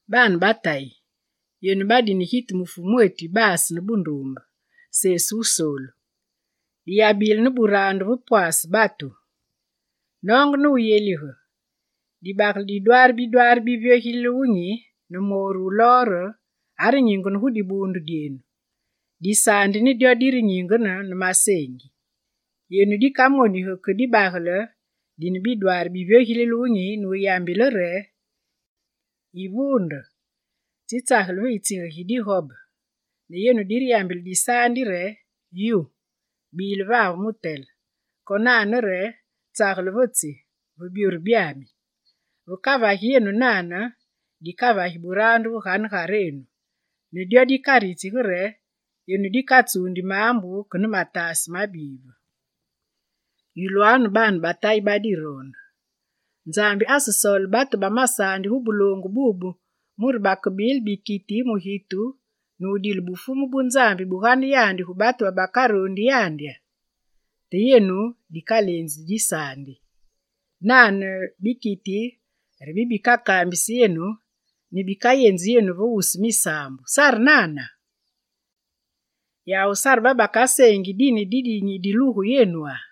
Baane ba Tayi, yenu badine gitu mu Fumwetu yibaase ne bunduumbe, Sesu Wusoolu, diyabile ne buraandu ve pwaase batu. Noonge ne wuyelige, dibagele didwaare bidwaari bivyogilile wunyi, ne mooru wu lor are nyingene gu dibuundu dyenu, disaandi ne dyo direnyingene ne maseengi. Yenu dikamonigi ke dibagele dine bidwaari bivyogilile wunyi nuyambile re: «Yivuunde, tsitsageli ve yitsige gi digobe!» Ne yenu direyambile disaandi re: «Yu, bile vave mutele» konane re: «Tsagele ve tsi, ve byoru byami». Vekavagi yenu nane, dikavagi buraandu ve ganegarenu ne dyo dikaritsigi re, yenu dikatsuundi maambu ke ne mataase mabive. Yulwanu baane ba Tayi badiroonde, Nzambi asesoole batu ba masaandi gu buloongu bubu mure bakebile bikiti mu gitu ne wudile bufumu bu Nzambi bugane yandi gu batu bakaroondi yandya? Te yenu, dikaleenzi disaandi. Nane bikiti re bibikakaambisi yenu ne bikayenzi yenu ve wusu misaambu, sare nana? Yawu sare babakaseengi dine didinyi dilugu yenwa?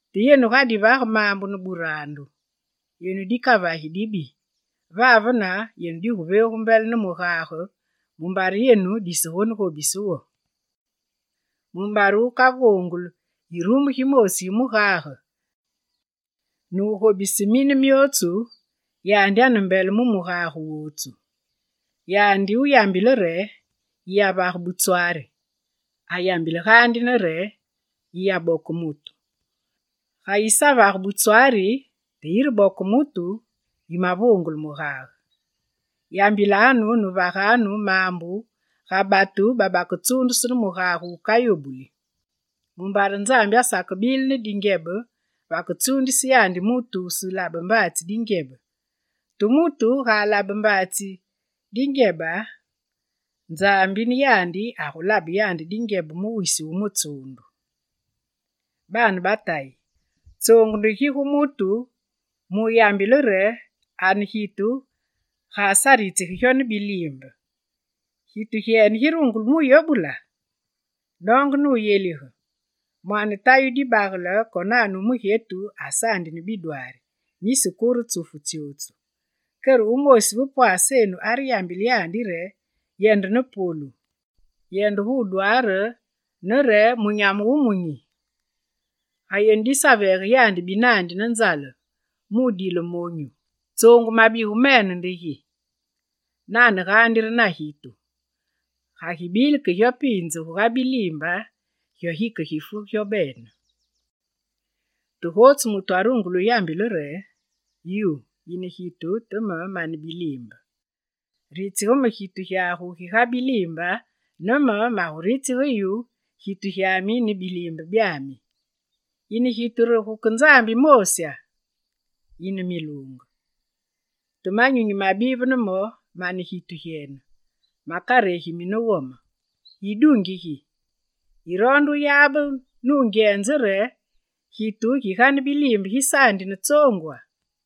Te yenu ga divage maambu ne buraandu, yenu dikavagi dibi, vavene yenu diguveegu mbele ne mugage mumbare yenu disegonegobise wo. Mumbare wukavoonguli irumu gimoosi gi mugage, nugobise mine myootsu, yandi ane mbele mu mugage wootsu. Yandi wuyambile re: «Yiyavage butswari», ayambile gaandi ne re: «Yiyaboke mutu». Ga yisavage butswari te yireboke mutu, yimavoongule mugage. Yambilanu ne vaganu maambu ga batu babaketsuundusu ne mugage wukayobuli. Mumbare Nzambi asakebile ne dingyebe vaketsuundise yandi mutu wuselabe bambaatsi dingyebe; te mutu ga alabe bambaatsi dingyebe, Nzambi ne yandi agulabe yandi dingyebe wisu wu mutsuundu. Baane ba Tayi, tsoongu nde gi gu mutu mu wuyambile re ane gitu ga asaritsige gyo ne biliimbe? Gitu gyene girungule muyobula? Noonge ne wuyelige, mwaane tayi wu dibagele konane wu mugyetu asaandi ne bidwaari, nisi kure tsufu tsyootsu. Kere wumoosi ve pwaasenu areyambile yandi re: «Yende ne polu, yende gudwaare, ne munyamu wumunyi». Ga yenu disaveege yandi binandi ne nzale mu wudile monyu, tsoongu mabigu mene nde gi? Nane gaandi re na gitu: ga gibile ke gyo piinze guga biliimbe, gyo gikegifu gyo bene. Te gotsu mutu arungule wuyambile re: «Yu, yine gitu te me mane biliimbe!» Ritsige me gitu gyagu giga biliimbe, ne me maguritsige yu gitu gyami ne biliimbe byaami. Yine gitu re guke Nzambi moosya? Yine miluunge. Te manyunyi mabive ne mo, mane gitu gyene, makaregimi ne wome. Idungi gi! Yiroonde wuyabe nungyenze re gitu giga ne biliimbe gisaandi ne tsoongwa?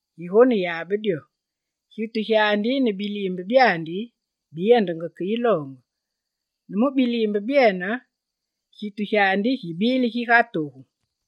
Yigonelabe dyo: gitu gyandi ne biliimbe byandi biyendenge ke yiloonge, ne mu biliimbe byene, gitu gyandi gibile giga togu.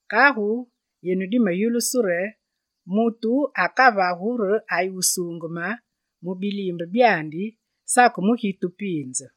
Kagu yenu dimeyulusu re mutu akavagu re ayi wusuungeme mu biliimbe byandi, sake mu gitu piinze.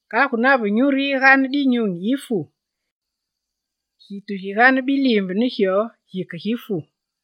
Kagu nave nyuru yiga dinyunyi yifu, gitu giga ne biliimbe gikegifu.